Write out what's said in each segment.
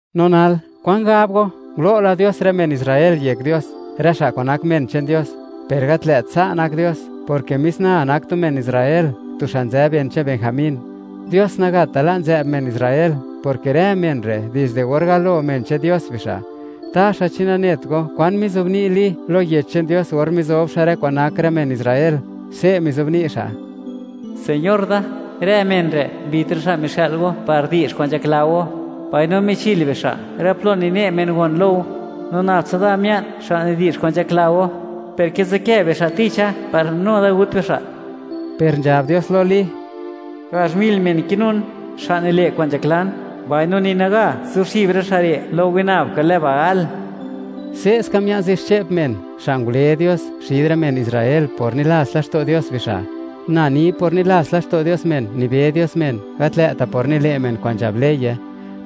No nal, ¿kwan gab go?, ¿ngulo' la Dios rë men Israel yek Dios, rë xa' kwa'n nak men che'n Dios? Per, ¡gat lë't sa' nak Dios!, porke mis na nak tu men Israel, tu xa' nzë ben che'n Benjamín. Dios nagata' la' nzë'b men Israel, porke rë men re', dizde or galo men che'n Dios bixa'. Taxa, ¿chi nanet go, kwan mizobni' Li lo Yech che'n Dios or mizob xa' rë kwa'n nak rë men Israel? Se' mizobni' xa': “Señor da, rë men re' mbit rë xa' mixë'l Go par di'zh kwa'n nzhakla Go, mbaino michil bixa' rë plo nine' men gon lo Go, no nab tsa da mia'n, xa' nidi'zh kwa'n nzhakla Go, per kizikë bixa' ticha par nu da gut bixa'.” Per nzhab Dios lo Li: “Gazh mil men kinun, xa' nile' kwa'n nzhaklan, mbaino ni naga zuxib rë xa' re' lo winab kwa'n lë Baal.” Se'ska mia'n zixche'p men, xa' ngule Dios xid rë men Israel por nilats laxto' Dios bixa'. Na ni por nilats laxto' Dios men nibe Dios men, gat lë'ta' por nile' men kwa'n nzhab leye;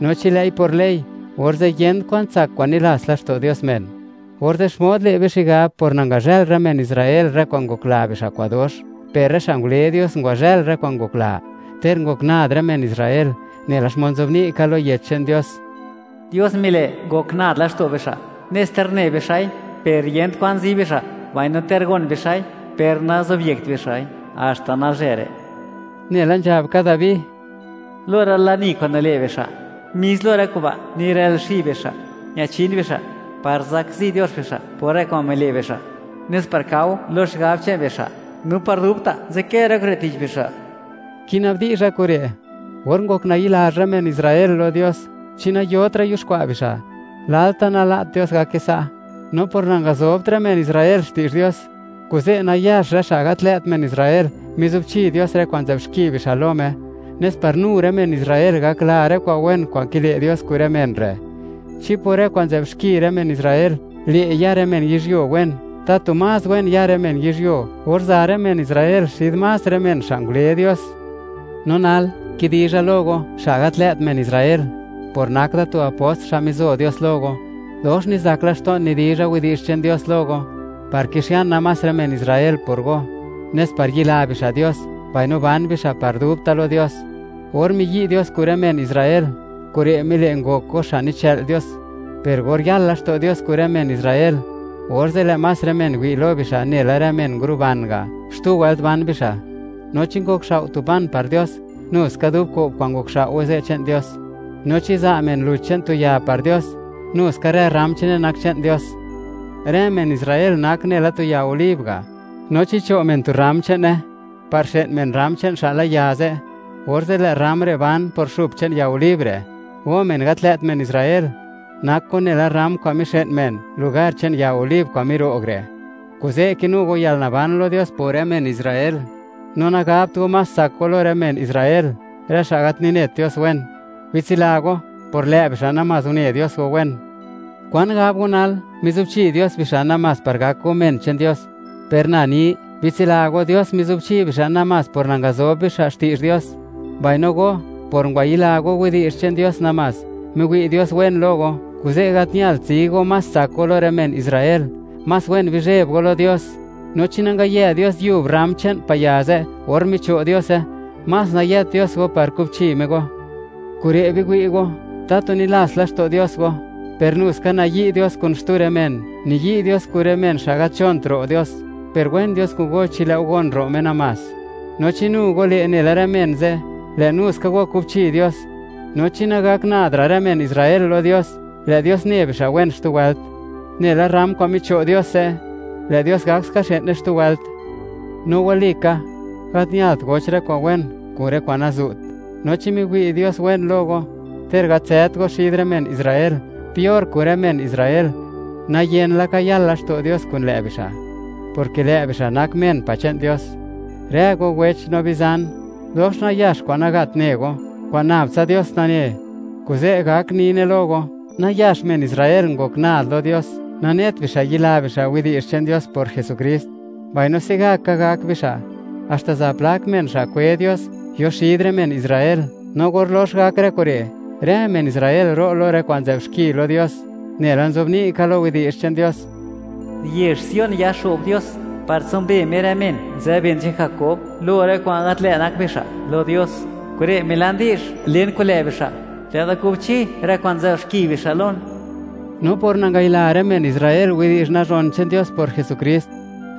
no chi lë'i por ley, orze' yent kwan tsak kwa'n nilats laxto' Dios men. Orze', ¿xmod le' be xigab por nangazhël rë men Israel rë kwa'n ngokla bixa' kwa'n dox? Per rë xa' ngule Dios ngwazhël rë kwa'n ngokla, ter ngok nad rë men Israel. Nela xmod nzobni' ka lo Yech che'n Dios: Dios mile' ngok nad laxto' bixa', nes ter ne bixa'i, per yent kwa'n zi bixa', mbaino ter gon bixa'i, per nazobyekt bixa'i, haxta nalzhë re'. Nela nzhab ka Dabi: Lo rë lani kwa'n nile' bixa', mis lo rë kuba' nirël xib bixa', ñachin bixa'; par zakzi Dios bixa' por rë kwa'n mile' bixa', nes par kao lo xigab che'n bixa', no par dubta' nzadkë rë kure' tich bixa'. Kina'bdizha kure': Or ngok nayi'lazh rë men Israel lo Dios, ¿chi nayotra' yuxkwa' bixa'? ¡Lalta' nala't Dios gake sa'!, no por nangazobt rë men Israel xti'zh Dios, kuze' nayax rë xa' gat lë't men Israel, mizubchi Dios rë kwa'n nzë'b xki bixa' lo Me, nes par nu rë men Israel gakla rë kwa'n wen kwa'n kile' Dios kun rë men re'. Chi por rë kwa'n nzë'b xki rë men Israel le' ya rë men yizhyuo wen, ¡tatu más wen ya rë men yizhyuo, or za rë men Israel xid más rë men xa' ngule Dios! No nal, kidizha lo go, xa' gat lë't men Israel. Por nak da tu apost xa' mizo Dios lo go, dox nizak laxto'n nidizha widi'zh che'n Dios lo go, par kixiana más rë men Israel por go, nes par yila bixa' Dios, mbaino ban bixa' par dubta' lo Dios. Or miyi' Dios kun rë men Israel, kure' mile' ngok go xa' nichë'l Dios. Per or yal laxto' Dios kun rë men Israel, orze', ¡lë' más rë men wi' lo bixa' nela rë men nguruban ga', xtu wëlt ban bixa'! No chi nizuxkwa' xa' tu pan par Dios, nu ska dub ko'b kwa'n ngokxao'we ze' che'n Dios; no chi za' men luch che'n tu ya par Dios, nu ska rë rram che'ne nak che'n Dios. Rë men Israel nak nela tu ya olib ga'. No chi cho' men tu rram che'ne par xë'n men rram che'n xa'la ya ze', orze' lë' rram re' ban por xup che'n ya olib re'. Go men gat lë't men Israel, nak go nela rram kwa'n mixë'n men lugar che'n ya olib kwa'n miro'g re', kuze' kinu go yalnaban lo Dios por men Israel. No nagabt go, más tsak go lo rë men Israel, rë xa' gat ninet Dios wen. Bitsila go, por lë' bixa' namás une Dios go wen. ¿Kwan gab go nal?, mizubchi Dios bixa', namás par gak go men che'n Dios. Per na ni: Bitsila go, Dios mizubchi bixa' namás por nangazob bixa' xti'zh Dios, mbaino go, por ngwayila go widi'zh che'n Dios namás, miwi' Dios wen lo go. Kuze', gat ñalt zi go más tsak go lo rë men Israel. Más wen bizheb go lo Dios. No chi nangayë Dios yub rram che'n pa' ya ze' or micho' Diose, más nayët Dios go par kubchi Me go. Kure' biwi' go, tatu nilats laxto' Dios go, per nu ska nayi' Dios kun xtu rë men: Niyi' Dios kun rë men xa' gat nzhont ro' Dios, per wen Dios kun go chi lë'u gon ro' Me namás; no chi nu go le' nela rë men ze', lë' nu ska go kubchi Dios. No chi nagak nad ra' rë men Israel lo Dios, lë' Dios ne bixa' wen xtu wëlt; nela rram kwa'n micho' Dios ze', lë' Dios gakska xë'ne xtu wëlt. No walika, gat ñalt goch rë kwa'n wen kun rë kwa'n nazu't; no chi miwi' Dios wen lo go ter gat nzët go xid rë men Israel; peor kun rë men Israel, nayen laka yal laxto' Dios kun lë' bixa', porke lë' bixa' nak men pa' che'n Dios. Rë go wech no bizan, dox nayax kwa'n nagat ne go, kwa'n nab tsa Dios nane, kuze' gak nine lo go: Nayax men Israel ngok nad lo Dios, nanet bixa' yila bixa' widi'zh che'n Dios por Jesukrist; mbaino se'gaka gak bixa' haxta za plak men xa' kwe Dios yo xid rë men Israel. No or lox gak rë kure', rë men Israel ro' lo rë kwa'n nzë'b xki lo Dios. Nela nzobni' ka lo Yech che'n Dios: Yezh Sion yaxo'b Dios, par tsimbe Me rë men nzë ben che'n Jakob lo rë kwa'n gat lë' nak bixa' lo Dios. Kure' milan di'zh len kun lë' bixa': Lë' da kubchi rë kwa'n nzë'b xki bixa' Lon. No por nangayila rë men Israel widi'zh nazhon che'n Dios por Jesukrist,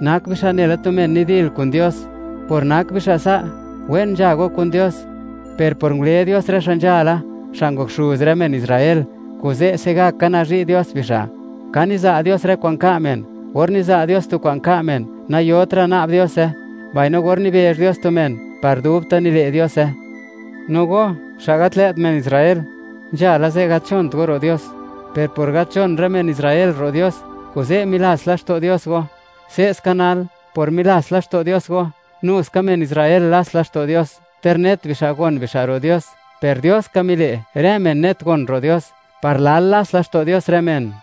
nak bixa' nela tu men nidil kun Dios. Por nak bixa' sa', wen nzha go kun Dios. Per por ngule Dios rë xa' nzhala, xa' ngok xuz rë men Israel, kuze' se'gaka nazhi' Dios bixa'. Ka niza' Dios rë kwa'n ka' men. Or niza' Dios tu kwa'n ka' men, nayotra' na'b Diose; mbaino or nibezh Dios tu men, par dubta' nile' Diose. No go, xa' gat lë't men Israel, nzhala ze' gat nzhont go ro' Dios; per por gat nzhon rë men Israel ro' Dios, kuze' milats laxto' Dios go. Se'ska nal, por milats laxto' Dios go, nu ska men Israel lats laxto' Dios, ter net bixa' gon bixa' ro' Dios. Per Dios ka mile', rë men net gon ro' Dios, par lal lats laxto' Dios rë men.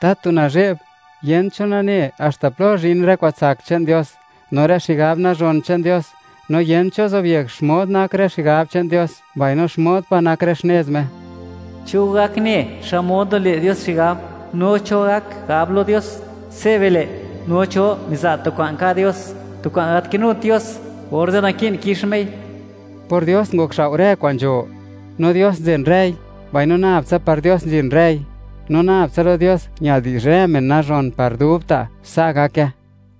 ¡Tatu nazhe'b!, yent cho nane haxta plo zhin rë kwa'n tsak che'n Dios, no rë xigab nazhon che'n Dios. No yent cho zobyek xmod nak rë xigab che'n Dios, mbaino xmod pa' nak rë xnez Me. ¿Cho gak ne, xmod nile' Dios xigab? ¿No cho gak gab lo Dios: “Se' bile'”? No, ¿cho miza' tu kwa'n ka' Dios, tu kwa'n gat kinut Dios, orze' naki'n kix Mei? Por Dios ngokxao' rë kwa'n nzho, no Dios nzen rëi, mbaino nab tsa par Dios nzhin rëi. No nab tsa lo Dios ñal di'zh rë men nazhon par dubta'. Sa' gake.